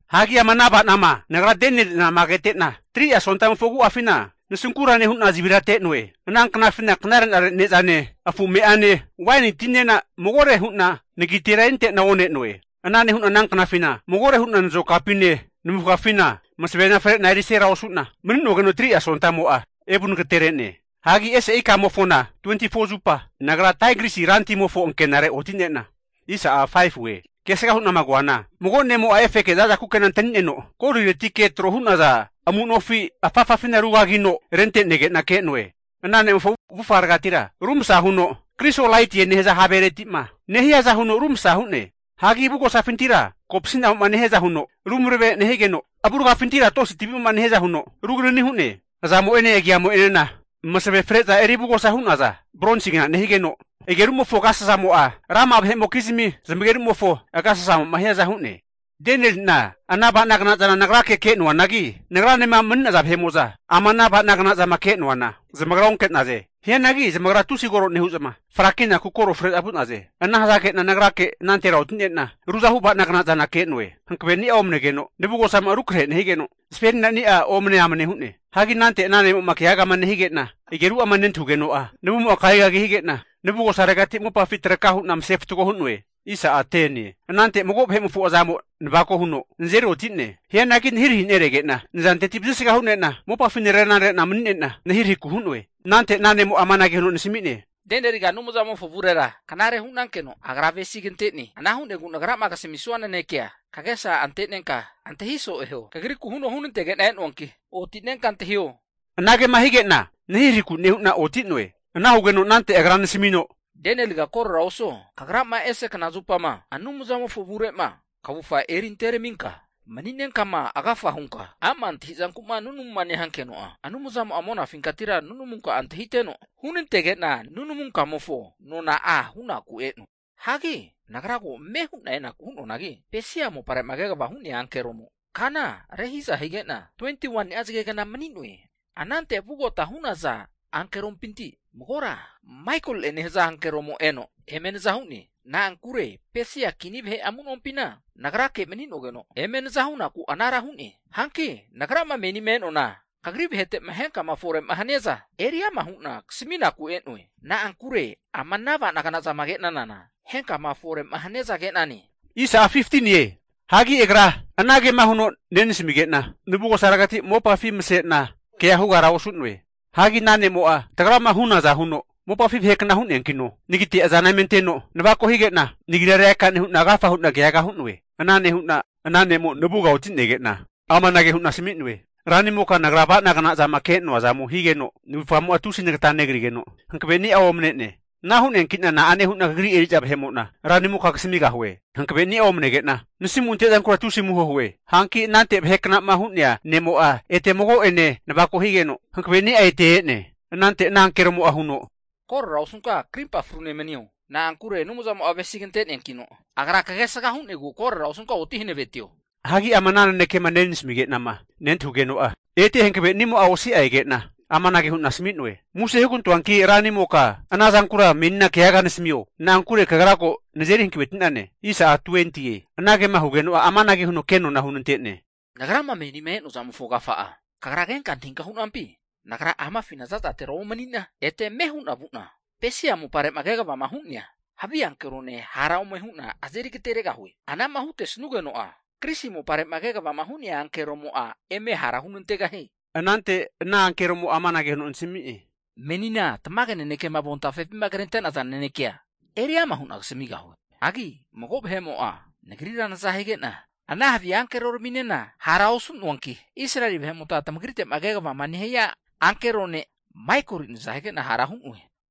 Hagi ama ana ava'nama nagra Danieli'nama kete'na, 3'a sontamofo agu'afina nasunkura nehu'na zavirate'noe. Ana knafina knare'nare ne'zane, afu me'ane, waini tinena magore hu'na nagitera erinte'na one'noe. Ana nehu'na ana knafina magore hu'na nazokapine navufgafina masavena fre'na erisera osu'na mani'nogeno 3'a sontamo'a evu nagatere'ne. Hagi ese ikamofona 24zupa nagra Taigrisi rantimofo ankenare oti'nena, kesgama hu'na koana, mago ne'mo'a efeke zaza kukena antani'neno, Goliretike tro hu'naza amu nofi afafafina rugagino rente'nege'na ke'noe. Ana ne'mofo avufgaregatira rumsa huno, krisolaitie nehaza haveretima nehiaza huno rumsa hu'ne. Hagi avugosafintira kopasi'namo'ma nehiaza huno rumarave nehigeno, avurgafintira tosi tavi'mo'ma nehiaza huno rugananini hu'ne. Azamo'ene agiamo'enena masave freza eri avugosa hu'naza bronsigna nehigeno, agerumofo agasasamo'a rama'a vahe'mokizmi zamagerumofo agasasamo'ma hiaza hu'ne. Danieli'na ana avanagna zana nagrake ke'noanagi, nagranema mani'naza vahe'mo'za ama ana ava'nagna zama ke'noana, zamagra onke'naze. Hianagi zamagra tusi koro nehu'za, frakinaku koro fre'za vu'naze. Ana hazage'na nagrake anantera oti'nena ruzahu ava'nagna zana ke'noe. Hankaveni'a omanegeno navugosamo'a rukrahe nehigeno, zaferinani'a omane amane hu'ne. Hagi anante ana nemo'ma keagama nehige'na ageru'ama nentahugeno'a, navumo'a kagigagi hige'na navugosaregati mopafi traka hu'na mase fatgo hu'noe. Anante mago vahe'mofo azamo navako huno nazeri oti'ne. Hianagi nahirahi neregena nazanteti vazisga hune'na mopafi narena re'na mani'nena nahirahiku hu'noe. Anante ana ne'mo'a amanage huno nasami'ne, Danieliga Anumzamofo avurera knare hu'nankeno Agra avesigante'ne. Ana hu'negu nagrama kasamisnua nanekea kagesa ante'nenka antahi so'e huo. Kagriku huno hunantege'na e'noanki, oti'nenka antahio. Anagema hige'na nahirahiku nehu'na oti'noe. Ana hugeno anante agra nasamino, Danieliga korora osuo, kagrama ese kna zupama Anumzamofo avure'ma kavufga erinte raminka mani'nenkama, agafa hunka ama' antahi'zanku'ma nunamuma nehankeno'a, Anumzamo'a monafinkatira nunamunka'a antahiteno, hunantege'na nunamunka'amofo nona'a hunaku e'noe. Hagi nagra ko ame hu'na enaku hu'noanagi, Pesia mopare'ma kegavama hu'nea ankeromo kana rehiza hige'na, 21ni'a zagegna mani'noe. Anante vugota hu'naza ankerompinti magora Maikoli'e nehaza ankeromo eno eme naza hu'ne. Na'ankure Pesia kini vahe amunompina nagrake mani'nogeno eme naza hunaku anara hu'ne. Hanki nagrama menima e'noana, kagri vahete'ma henkama fore haniaza eri ama hu'na kasaminaku e'noe. Na'ankure ama ana ava'nagna zama ke'nanana henkama fore'ma haniaza ke'nane. Hagi agra anagema huno nenasamige'na navugosaregati mopafi masena kea hugara osu'noe. Hagi ana nemo'a tagrama hunaza huno mopafi vahekna hu'neankino, nagite azana eme anteno navako hige'na, nagira reaka nehu'na agafa hu'na keaga hu'noe. Ana nehu'na ana ne'mo'a navuga oti'nege'na amanage hu'na asami'noe. Ranimoka nagra ava'nagna zama ke'noa zamo higeno navufgamo'a tusi nata negrigeno hankaveni'a omane'ne. Ana hu'neanki'na na'ane hu'na kagri eri'za vahemo'na ranimoka kasamigahue. Hankaveni'a omanege'na nasimu'ma ante'zankura tusi amuho hue. Hanki anante vaheknama hu'nea ne'mo'a ete mago'ene navako higeno, hankavenimo'a ete e'ne. Anante ana ankeromo'a huno, Korora osunka karimpa frune manio! Na'ankure Anumzamo'a avesigante'neankino, Agra kagesga hu'negu korora osunka oti hankavetio. Hagi ama ana nanekema nenasamige'nama nentahugeno'a, ete hankavenimo'a osi'a ege'na amanage hu'na asami'noe. Muse hugantoanki ranimoka, ana zankura menina keaga nasamio. Na'ankure kagra ko nazeri hankaveti'nane. Anagema hugeno'a amanage huno kenona hunante'ne. Nagrama menima e'noa zamofo agafa'a kagra kenka antahinka hu'nampi? Nagra amafina za'zatera omani'na ete ame hu'na vu'na, Pesia mopare'ma kegavama hu'nea havi ankerone hara ome hu'na azeri agateregahue. Anama hutesnugeno'a Grisi mopare'ma kegavama hu'nea ankeromo'a eme hara hunantegahie. Anante ana ankeromo'a amanage huno nasami'ne. Menina tamage nanekema avontafepima krente'naza nanekea eri ama hu'na kasamigahue. Hagi mago vahe'mo'a nagrira naza hige'na ana havi ankeroraminena hara osu'noanki, Israeli vahe'mota tamagrite'ma kegavama nehia ankero ne' Maikoli naza hige'na hara hu'noe.